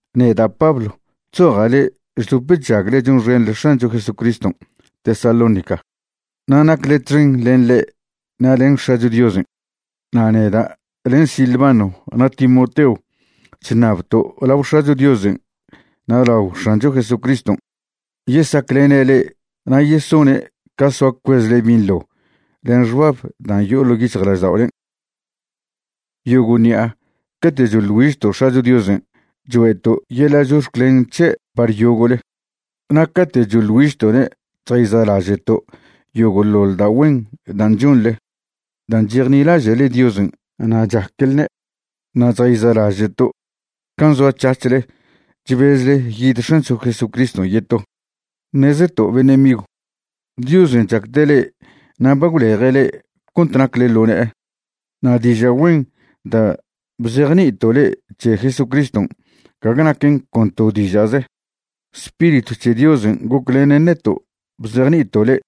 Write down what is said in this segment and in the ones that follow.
Neda' Pablo chzoja' le'e chdop chžagle chonxenḻe X̱ancho Jesucriston' Tesalónica na' nacle txen len ḻe' na' len X̱acho Diosen'. Na' neda' len Silvano na' Timoteo chṉabto' lao X̱acho Diosen' na' lao X̱ancho Jesucriston' yesaclene' le'e na' yesone' ca soa cuezle binḻo len xbab dan' yo'o ḻo' yic̱hjlažda'olen'. Yogo' ṉi'a cate' choḻ güižto' X̱acho Diosen' choe'to' yeḻa' chox̱clen c̱he' par yogo'le. Na' cate' choḻ güižto'ne' chjayza'laže'to' yogo'ḻoḻ da' güen dan' chonḻe dan' chejnilaže'le Diosen' na' chaquelne'. Na' chjayza'laže'to' can' zoac̱hac̱hle chbezle yid X̱ancho Jesucriston' yeto. Ṉezeto' beṉe' migw, Diosen' chacde' le'e na' ba gwleje' le'e cont nacle ḻo ne'e. Na' diža' güen da' bzejni'ito' le'e c̱he Jesucriston' gague naquen con to diža'ze. Spiritw c̱he Diosen' goclenen neto' bzejni'ito' le'e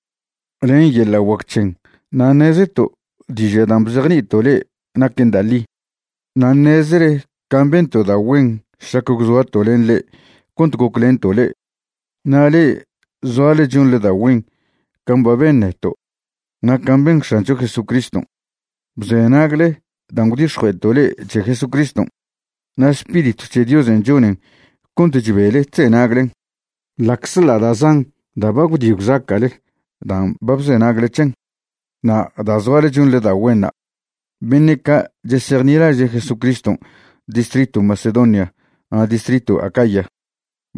len yeḻa' guac c̱hen na' ṉezeto' diža' dan' bzejni'ito' le'e naquen da' ḻi. Na' ṉezele can' bento' da' güen šlac gwzoato' len le'e cont goclento' le'e. Na' le'e zoale chonḻe da' güen can' ba ben neto' na' can' ben X̱ancho Jesucriston'. Bzenagle dan' gwdix̱jue'eto' le'e c̱he Jesucriston', na' Spiritw c̱he Diosen' chonen cont chbele chzenaglen, ḻa'czḻa' da' zan da' ba gwdi gwzaca'le dan' ba bzenagle c̱hen'. Na' da' zoale chonḻe da' güenṉa', beṉe' ca' chesejnilaže' Jesucriston' distritw Macedonia na' distritw Acaya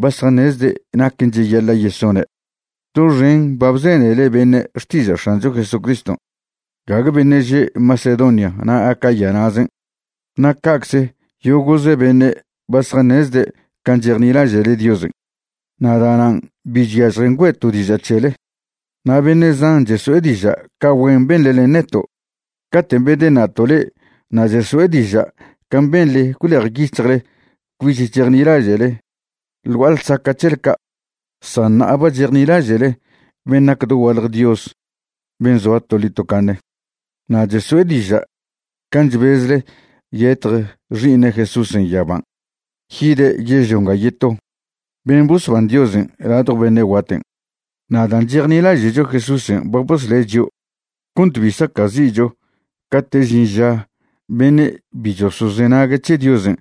ba zjaṉezde' naquen cheyaḻa' yesone'. Doxen ba bzenele beṉe' xtiža' X̱ancho Jesucriston', gague beṉe' že' Macedonia na' Acaya na'zen'. Na' ca'cze yogo'ze beṉe' ba zjaṉezde' can' chejnilaže'le Diosen', na' da'nan' bi chyažjen güe'to' diža' c̱hele. Na' beṉe' zan cheso'e diža' ca güen beṉle len neto' caten' bedeṉa'to' le'e na' cheso'e diža' can' benḻe gwlejyic̱hjle cbich chejnilaže'le ḻ gua'a ḻsaca' c̱hele ca', san ṉa'a ba chejnilaže'le ben' nac dogualje Dios ben' zoa toḻi tocaṉe. Na' cheso'e diža' can' chbezle yetj Xi'iṉe' Jesúsen' yaban' yide' yežlio nga yeto, ben' bosban Diosen' ladjo beṉe' guaten'. Na' dan' chejnilaže'cho Jesúsen' ba bosle' chio' cont bi saca'zi'cho cate' žin ža beṉe' bi chosozenague' c̱he Diosen'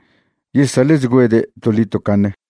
yesaḻe'chgüede' toḻi tocaṉe.